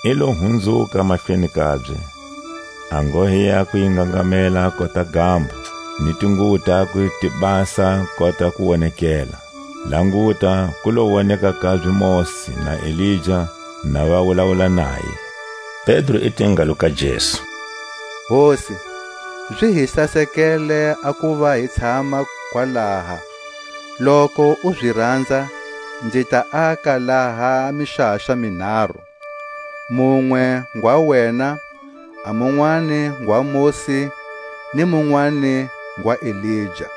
I lo hunzuka mahlweni kabye; a nghohe yakwe yi ngangamela kota gambo, ni tinguwo takwe ti basa kota kuwonekela. Languta, ku lo woneka kabye Mosi na Elija na va wulawula naye. Pedro i te ngalo ka Jesu: Hosi, zi hi sasekele a kuva hi tshama kwalaha. Loku u zi ranza nzi ta aka laha mixaxa minharu; munwe ngwa wena, a munwani ngwa Mosi, ni munwani ngwa Elija.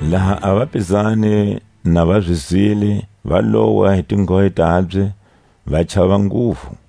Laha a vapizani na va zi zwile, va lowa hi tinghohe tabye, va chava nguvu.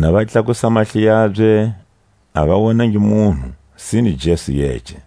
Na va tlakusa mahlo yabye, a va wonangi munhu, sine Jesu yece.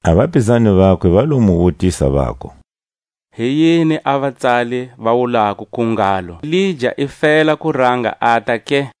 A vapizani vakwe va lo mu wutisa, vaku: Hi yini a vatsali va wulako kil ngalo Elija i fela ku ranga ata ke?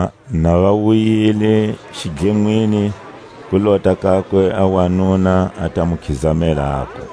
Laha na va wuyile xidlenwini, ku lota kakwe a wanuna, a ta mu khizamela, aku: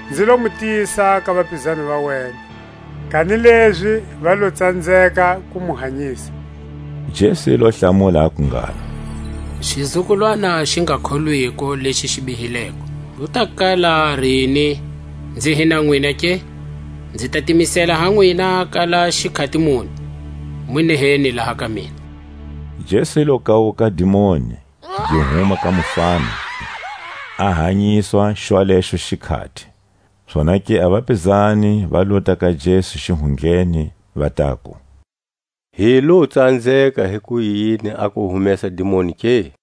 Nzi lo mu tisa ka vapizani va wena, kanilezi va lo tsanzeka ku mu hanyisa. Jesu i lo hlamula, aku ngalo: Xizukulwana xi nga kholwiko leʼxi bihileko, ku ta kala rini nzi hi na nwina ke? Nzi ta timisela ha nwina kala xikhati muni? Mu neheni laha ka mina. Jesu i lo kawuka a dimoni, gi huma ka mufana, a hanyiswa xwalexo xikhati. Zonake a vapizani va lota ka Jesu xihundleni, va taku: Hi lo tsanzeka hikuyini a ku humesa dimoni ke?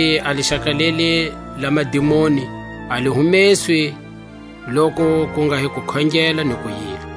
Kanilezi a lixaka leli la madimoni a li humeswi, lokuku nga hi kukhongela ni ku yila.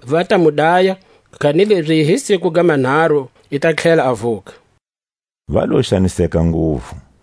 Va ta mu daya, kanilezi hi siku ga manharu i ta tlhela a vuka. Va lo xaniseka nguvu. A mali ya nzhuvo.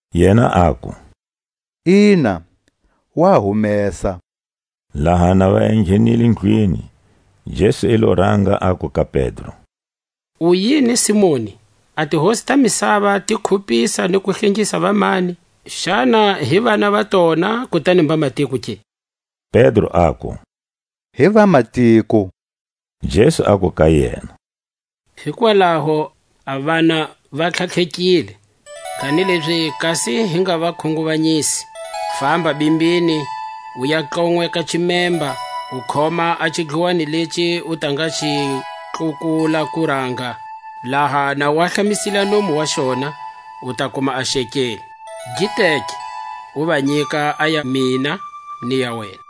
Yena aku: Ina, wa humesa. Laha na va enghenile ndlwini, Jesu ilo ranga aku ka Pedro: U yini Simoni? A tihosi ta misava ti khupisa ni ku hlengisa vamani? Xana hi vana va tona kutani mbamatiko ke? Pedro aku: Hi vamatiko. Jesu aku ka yena: Hikwalaho a vana va tlhatlhekile, kanilezi kasi hi nga va khunguvanyisa famba bimbini, u ya tlonweka ximemba, u khoma a xidluwani lexi u ta nga xi tlhukula kuranga. Laha na u ahlamisile a nomu wa xona, u ta kuma a xekeli; gi teke, u va nyika a ya mina ni ya wena.